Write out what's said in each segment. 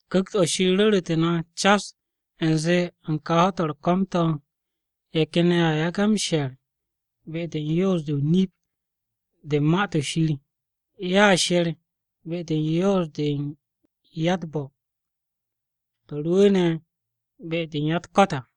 Ku̱kt-o̱ Shir ru̱ru̱tu̱ na cas u̱nze u̱n kà ho̱-to̱ u̱r-ko̱m to̱, ye̱ ken ye̱ a yage̱ m-she̱r be-de u̱n yoos-de o-nip de u̱n Ma-to̱ Shir. Ye̱a she̱r be-de u̱n yoos-de u̱n ya-u̱t-bo̱, to̱ rwu̱u̱ne̱ be-de u̱n ya-u̱t-ko̱t à.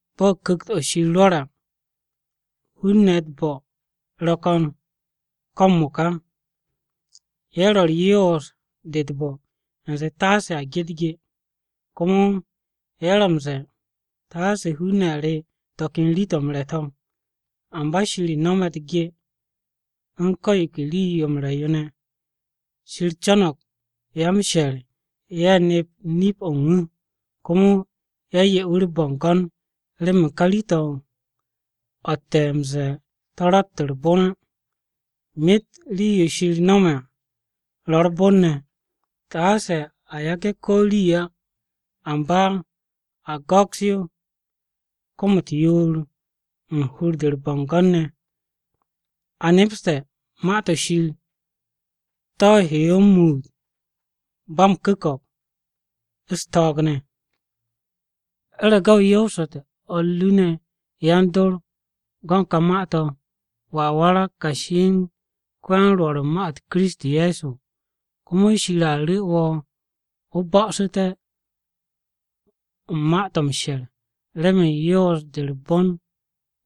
Bo̱ Ku̱kt-o̱ Shir rwo̱re̱ à, hun-ne̱ ye̱ u̱t-bo̱ ro̱ ko̱n ko̱ m-mo̱ka: Ye̱ ro̱ u̱r-yoos de u̱t-bo̱ u̱nze taase hun-ne̱ ge u̱t-ge. Komo ye̱ ro̱ m-ze̱e̱ taase hun-ne̱ re̱ to̱ ken rii-to̱ m-re̱ to̱. Amba Shir no̱me̱ u̱t-ge u̱n ko̱ yo ke rii-yo m-re̱ yo ne̱. Shir co̱no̱g ya-m-she̱r ye̱ nep nip-o̱ u̱n wu̱, komo ye̱ 'ye wu̱ u̱r-bo̱ngo̱n remen ka rii-to̱, o̱tte̱ m-ze̱e̱ to̱ rott u̱r-bon á. Myet rii-yo Shir nome̱ à ro̱ u̱r-bon ne̱, taase a yage̱ ko̱ rii á. Amba a go̱ks yo kom-u̱t yoor u̱n hur-de u̱r-bo̱ngo̱n ne̱. A nepste̱ Ma-to̱ Shir to̱ he yo m-muut ba m-ku̱ko̱p u̱s-to̱o̱g ne̱. U̱rege̱ o yoosu̱te̱ o̱r ru ne̱ yan-dor go̱n ka ma-to̱, wo̱a warag kashi u̱n ko-ya-m-Rwo̱r u̱n ma-u̱t Kiristi Ye̱so, komo Shir a ru̱ wo̱ o bo̱'o̱su̱te̱ u̱n ma-to̱ m-she̱r remen yoos-de u̱r-bon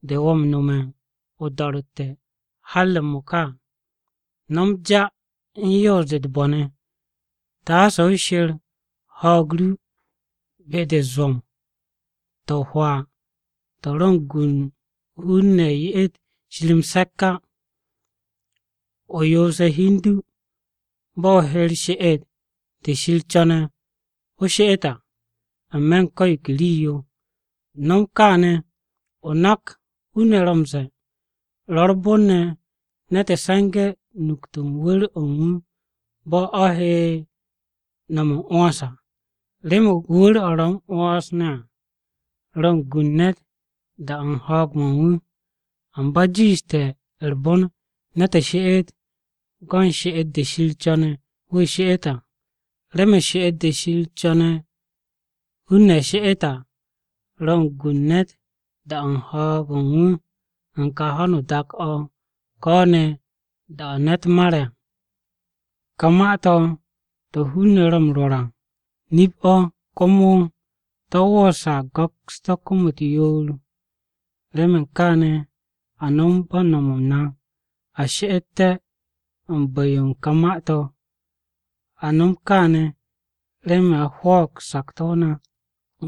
de wo̱ m-no̱me̱ o-do̱ro̱tte̱ har m-mo̱ka à. No̱m ja u̱n yoos-de u̱t-bo̱ ne̱, taase o she̱r ho̱o̱g ru be-de u̱t-zwo̱m to̱ o-hwaa to̱ ro̱ u̱n gu u̱n hun-ne̱ ye'et Shir m-se̱k á. O yoose̱ hi u̱n du bo̱ o he u̱r-she'et de Shir co̱ne̱ o she'et à n-me̱ u̱n ko̱ yo ke rii-yo. No̱m kaane̱ o nak hun-ne̱ ro̱ m-ze̱e̱, “Ro̱ u̱r-bon ne̱ ne̱t se̱nge̱ nukt u̱n wu̱r-o̱ u̱n wu̱ bo̱ o̱ he no̱m m-'wo̱ns à.” Remen wu̱r-o̱ ro̱ m-'wo̱ns ne̱ à, ro̱ u̱n gu u̱n ne̱t da-o̱ u̱n ho̱o̱g-mo̱ u̱n wu̱. Amba jiishte̱ u̱r-bon ne̱t she'et go̱n she'et-de Shir co̱ne̱ wu̱ she'et à. Remen she'et-de Shir co̱ne̱ hun-ne̱ she'et à, ro̱ u̱n gu u̱n ne̱t da-o̱ u̱n ho̱o̱g-mo̱ u̱n wu̱ u̱n ka ho̱no o-dak o̱ ko̱ ne̱ da-o̱ ne̱t mare̱ à. Ka ma-to̱, to̱ hun-ne̱ ro̱ m-rwo̱r à, nip-o̱ komo to̱ woose̱ a go̱ks-to̱ kom-u̱t yoor. Remen kaane̱ a nom no̱ bo̱ m-no̱m na. A she'ete̱ u̱n bu̱-yo u̱n ka ma-to̱, a nom kaane̱ remen a hwo̱o̱g sakto̱-o na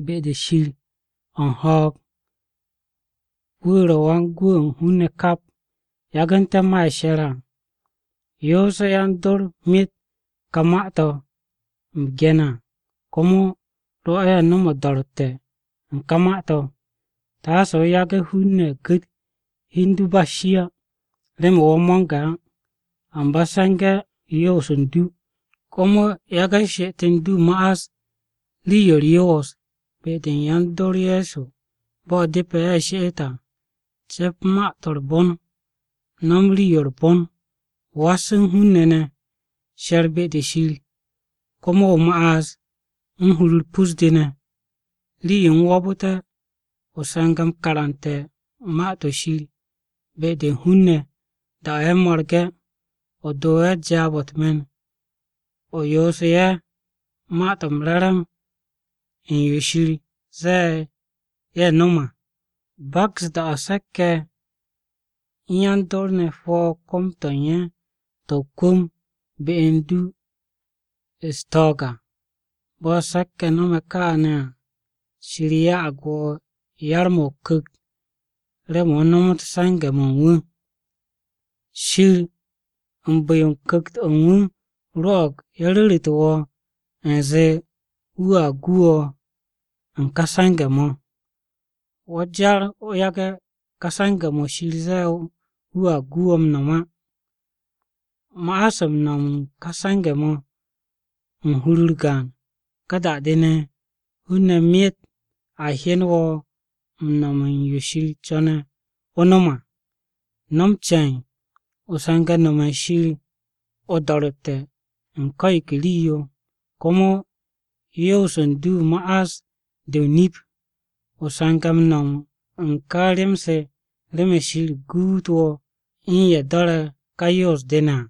be-de Shir o̱ u̱n ho̱o̱g. Wu̱ ro̱ Wan-Gwu̱ o̱ u̱n hun-ne̱ kap, yagu̱nte̱ ma ye̱ she̱re̱ à. Yoose̱ yan-dor myet ka ma-to̱ u̱m ge̱ne̱ à, komo rwo̱ ye̱ nom o-do̱ro̱tte̱ u̱n ká ma-to̱. Taase o yage̱ hun-ne̱ gu̱t hi u̱n du ba u̱s-shi á, remen wo̱ mo̱nge̱ á. Amba se̱nge̱ yoos u̱n du. Komo yage̱ she'et u̱n du ma'as rii-yo u̱r-yoos be-de u̱n yan-dor Ye̱so bo̱ depe̱ ye̱ she'et à: Ce̱p ma-to̱ u̱r-bon. No̱m rii-yo u̱r-bon. Was u̱n hun-ne̱ ne̱. She̱r be-de Shir. Komo o ma'as u̱n hur-u̱r pus-de ne̱. Rii-yo u̱m wo̱o̱bu̱te̱, o se̱nge̱ m-karante̱ Ma-to̱ Shir be-de u̱n hun-ne̱ da-o̱ ye̱ mo̱rge̱. O do ye̱ jaab-o̱ u̱t-me̱n. O yoosu̱ ye̱ Ma-to̱ m-Re̱re̱m u̱n yo Shir ze̱e̱ ye̱ nom à. Baks da-o̱ se̱k-ye̱ u̱n yan-dor ne̱ hwo̱ kom-to̱ u̱n ye̱ to̱ o-kwu̱m be u̱n du ye̱ u̱s-ko̱n à. Bo̱ se̱k-ye̱ no̱me̱ kaane̱ à, Shir ya'ag wo̱ yar-mo̱ o-Ku̱kt remen o nomot se̱nge̱-mo̱ u̱n wu̱. Shir u̱n bu̱-yo u̱n Ku̱kt-o̱ u̱n wu̱ rwo̱'o̱g ye̱ ru̱ru̱tu̱ wo̱ u̱nze wu̱a gu wo̱ u̱n kà se̱nge̱-mo̱. Wo̱ jar o yage̱ ka se̱nge̱-mo̱ Shir ze̱e̱ wu̱a gu wo̱ m-no̱m á. Ma'as m-no̱m u̱n ka se̱nge̱-mo̱ u̱n hur-u̱r gaan. Ka da-de ne̱, hun-ne̱ myet a hyen wo̱ m-no̱m u̱n yo Shir co̱ne̱ o nom à. No̱m ce̱e̱n o se̱nge̱ no̱me̱ u̱n Shir o-do̱ro̱tte̱ u̱n ko̱ yo ke rii-yo. Komo yoos u̱n du ma'as de o-nip. O se̱nge̱ m-no̱m u̱n ka rem-se, remen Shir guut wo̱ u̱n ye̱ do̱re̱ ka yoos-de ne̱ à.